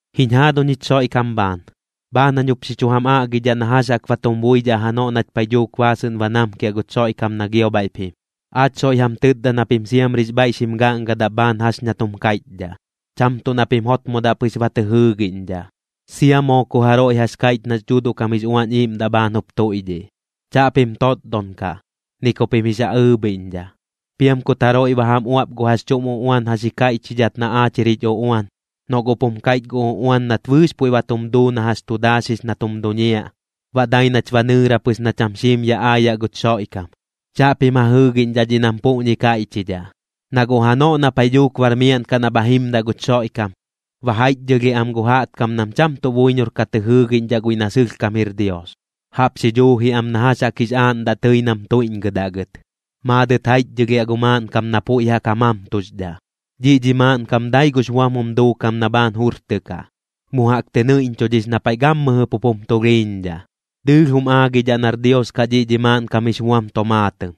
Jiñ jaaduñ jich Xoiꞌkam bhaan, bhaan jañ jup xi chu jam aꞌgidhaꞌ na jax jaꞌk ba tum buidhaꞌ janoꞌ nach paiꞌ dhuuk baasɨꞌn ba namkiaꞌ guch Xoiꞌkam na gio bhaiꞌp jim. Aach soiꞌ jam tɨtda na pim siamrix bhaiꞌ xim gaꞌngadaꞌ bhaan jax ña tum kaiꞌchdhaꞌ, cham tuꞌ na pim jotmodaꞌ pɨx ba tɨ jɨɨgiꞌñdhaꞌ, sia moo ku jaroiꞌ jax kaiꞌch nax Dhuuduꞌ kam jix Uañ Iiꞌmdaꞌ bhaan jup tuiꞌdhiꞌ. Chaꞌpim totdon kaꞌ, ni ku pim jix ja ɨɨbhiꞌñdhaꞌ. Piam kut jaroiꞌ ba jam uaꞌp gu jax chuꞌm uꞌuan jax ji kaiꞌchidhat na aach jir jich uꞌuan, noꞌ guꞌp jum kaiꞌch gu uꞌuan nat bɨɨx puiꞌ ba tum duu na jax tu daaxix na tum duñiaꞌ, baꞌ dai nach ba nɨɨra pɨx na cham xiim yaꞌ aayaꞌ guch Xoiꞌkam, chaꞌpim ja jɨɨgiꞌñdhaꞌ dhiꞌ nam puꞌñi kaiꞌchdhaꞌ. Na guꞌ janoꞌ na paiꞌ dhuuk bar miaꞌn kaꞌ na bha jimdaꞌ guch Xoiꞌkam, ba jaiꞌchdhɨlhiaꞌ am gu jaꞌtkam nam cham tuꞌ buiñor ka tɨ jɨɨgiꞌñdhaꞌ guiꞌ na sɨlhkam jir Dios, jaꞌp xi dhuuji am na jax jaꞌk jix aaꞌndaꞌ tɨi nam tuiꞌñgɨdaꞌ gɨt. Maadɨt jaiꞌchdhɨlhiaꞌ gu maaꞌnkam na puiꞌ jaꞌk ja mamtuxdhaꞌ. Dhiꞌ dhi maaꞌnkam dai gux buam jum duukam na bhaan jurtɨkaꞌ, mu jaꞌk tɨ nɨiꞌñchudhix na paiꞌ gammɨjɨ pup jum tulhiiñdhaꞌ. Dɨɨlh jum aagidhaꞌ nar Dios kaꞌ dhiꞌ dhi maaꞌnkam jix buam tomaatɨm,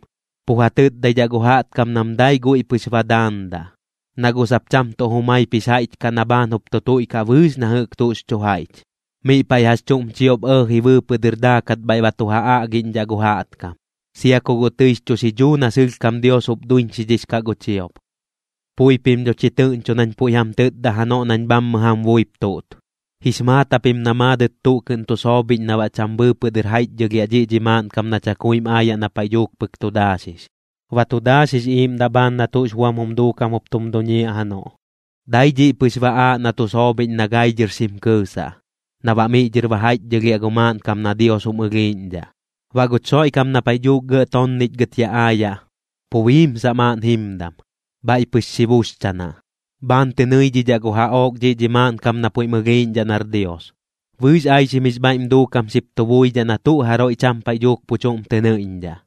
pu ja tɨtdaidhaꞌ gu jaꞌtkam nam dai guiꞌ pɨx ba daandaꞌ, na guꞌ sap cham tuꞌ jumaip jix jaiꞌch kaꞌ na bhaan jup tu tuiꞌkaꞌ bɨɨx na jɨꞌk tuꞌx chu jaiꞌch. Miꞌ paiꞌ jax chuꞌm chiop ɇɇji bɨɨpɨꞌ dɨr daakat bhaiꞌ ba tu ja aꞌgiꞌñdhaꞌ gu jaꞌtkam, sia ku guꞌ tɨix chu xidhuu na sɨlhkam Dios jup duiñxidhix kaꞌ gu chiop. Pui pim dho chi tɨꞌñcho nañ puiꞌ jam tɨtda janoꞌ nañ bhammɨ jam buip tuꞌt. Jix maat japim na maadɨt tuꞌ kɨꞌn tu soobhiꞌñ na baꞌ cham bɨɨpɨꞌ dɨr jaiꞌchdhɨlhiaꞌ dhiꞌ dhi maaꞌnkam na chakuim aayaꞌ na paiꞌ dhuuk pɨk tu daaxix. Ba tu daaxix iiꞌmdaꞌ bhaan na tuꞌx buam jum duukam jup tum duñiaꞌ janoꞌ, dai dhiꞌ pɨx ba aaꞌ na tu soobhiꞌñ na gai dhɨr xim kɨɨsaꞌ, na baꞌ miꞌ dhɨr ba jaiꞌchdhɨlhiaꞌ gu maaꞌnkam na Dios jum ɨlhiiꞌñdhaꞌ. Baꞌ guch Xoiꞌkam na paiꞌ dhuuk gɇꞌ tonnichgɨt yaꞌ aayaꞌ, pu biimsaꞌ maaꞌn jimdam, bhaiꞌ pɨx xi buxchanaꞌ. Bhaan tɨ nɨidhidhaꞌ gu jaꞌook dhi maaꞌnkam na puiꞌm ɨlhiiꞌñdhaꞌ nar Dios. Bɨɨx aixim jix bhaiꞌm duukam xip tu buidhaꞌ na tuꞌ jaroiꞌ cham paiꞌ dhuuk pu chuꞌm tɨ nɨiꞌñdhaꞌ,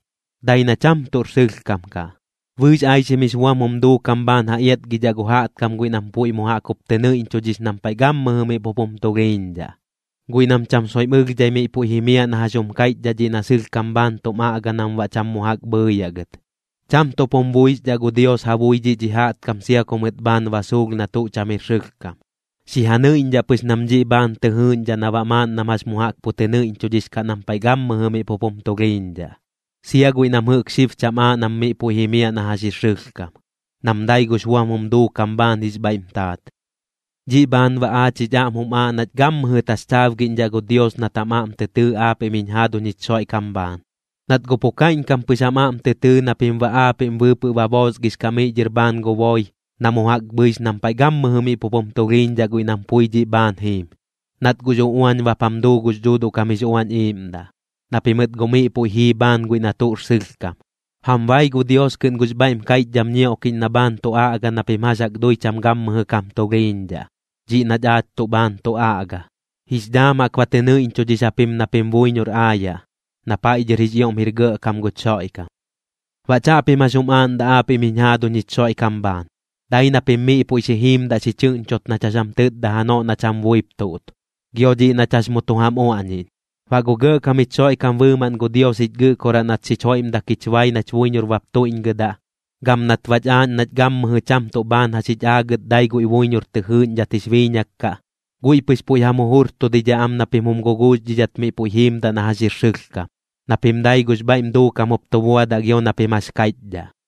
dai na cham tuꞌr sɨlhkam kaꞌ. Bɨɨx aixim jix buam jum duukam bhaan ja iatgidhaꞌ gu jaꞌtkam guiꞌ nam puiꞌ mu jaꞌk jup tɨ nɨiꞌñchudhix nam paiꞌ gammɨjɨ miꞌ pup jum tulhiiñdhaꞌ, guiꞌ nam cham soiꞌm ɨlhdhai miꞌ puiꞌ jimiaꞌ na jax jum kaiꞌchdhaꞌ dhiꞌ na sɨlhkam bhaan tum aꞌga nam baꞌ cham mu jaꞌk bhɨɨyaꞌ gɨt. Cham tuꞌp jum buixdhaꞌ gu Dios ja bui dhi jaꞌtkam sia ku mɨt bhaan ba suulh na tuꞌ cham jir sɨlhkam, xi ja nɨiꞌñdhaꞌ pɨx nam dhiꞌ bhaan tɨ jɨɨꞌñdhaꞌ na baꞌ maaꞌn nam jax mu jaꞌk pu tɨ nɨiꞌñchudhix kaꞌ nam paiꞌ gammɨjɨ miꞌ pup jum tulhiiñdhaꞌ, sia guiꞌ nam jɨꞌk xib cham aaꞌ nam miꞌ puiꞌ jimiaꞌ na jax jir sɨlhkam, nam dai gux buam jum duukam bhaan jix bhaiꞌm taat. Dhiꞌ bhaan baꞌ aach jich aꞌm jum aaꞌ nach gammɨjɨ taxchaabgiꞌñdhaꞌ gu Dios nat jam aꞌm tɨ tɨɨ aapiꞌm jiñ jaaduñ jich Xoiꞌkam bhaan, nat guꞌ pu kaiꞌñkam pɨx jam aꞌm tɨ tɨɨ na pim baꞌ aapiꞌm bɨɨpɨꞌ ba boosgix kaꞌ miꞌ dhɨr bhaan gu boi na mu jaꞌk bhɨix nam paiꞌ gammɨjɨ miꞌ pup jum tulhiiñdhaꞌ guiꞌ nam pui dhiꞌ bhaan jiim, nat guꞌx uꞌuañ bap jam duu gux Dhuuduꞌ kam jix Uañ Iiꞌmdaꞌ, na pimɨt guꞌ miꞌ puiꞌ jii bhaan guiꞌ na tuꞌr sɨlhkam. Jam bai gu Dios kɨꞌn gux bhaiꞌm kaiꞌchdham ñioꞌkiꞌñ na bhaan tu aꞌga na pim jax jaꞌk dui cham gammɨjɨ kam tulhiiñdhaꞌ, dhiꞌ nach aach tuꞌ bhaan tu aꞌga. Jix dhaam jaꞌk ba tɨ nɨiꞌñchudhix japim na pim buiñor aayaꞌ, na paiꞌ dhɨr jix ioꞌm jir gɇꞌkam guch Xoiꞌkam. Baꞌ chaꞌpim jax jum aaꞌndaꞌ aapiꞌm jiñ jaaduñ jich Xoiꞌkam bhaan, dai na pim miꞌ puiꞌ xi jiimdaꞌ xi chɨꞌñchot nach jax jam tɨtda janoꞌ nach jam buip tuꞌt, gio dhiꞌ nach jax mu tu jam uaꞌñiꞌñ. Baꞌ gu Gɇꞌkam jich Xoiꞌkam bɨɨmaꞌn gu Dios jich Gɨꞌkoraꞌ nat xich joiꞌmdak jich bai nach buiñor bap tuiꞌñgɨdaꞌ, gam nat bach aaꞌñ nach gammɨjɨ cham tuꞌ bhaan jax jich aagɨt dai guiꞌ buiñor tɨ jɨɨꞌñdhat jix biiñak kaꞌ, guiꞌ pɨx puiꞌ jam jujurtudidhaꞌ am na pim jum guguuxdhidhat miꞌ puiꞌ jiimdaꞌ na jax jir sɨlhkam, na pim dai gux bhaiꞌm duukam jup tu buadaꞌ gio na pim jax kaiꞌchdhaꞌ.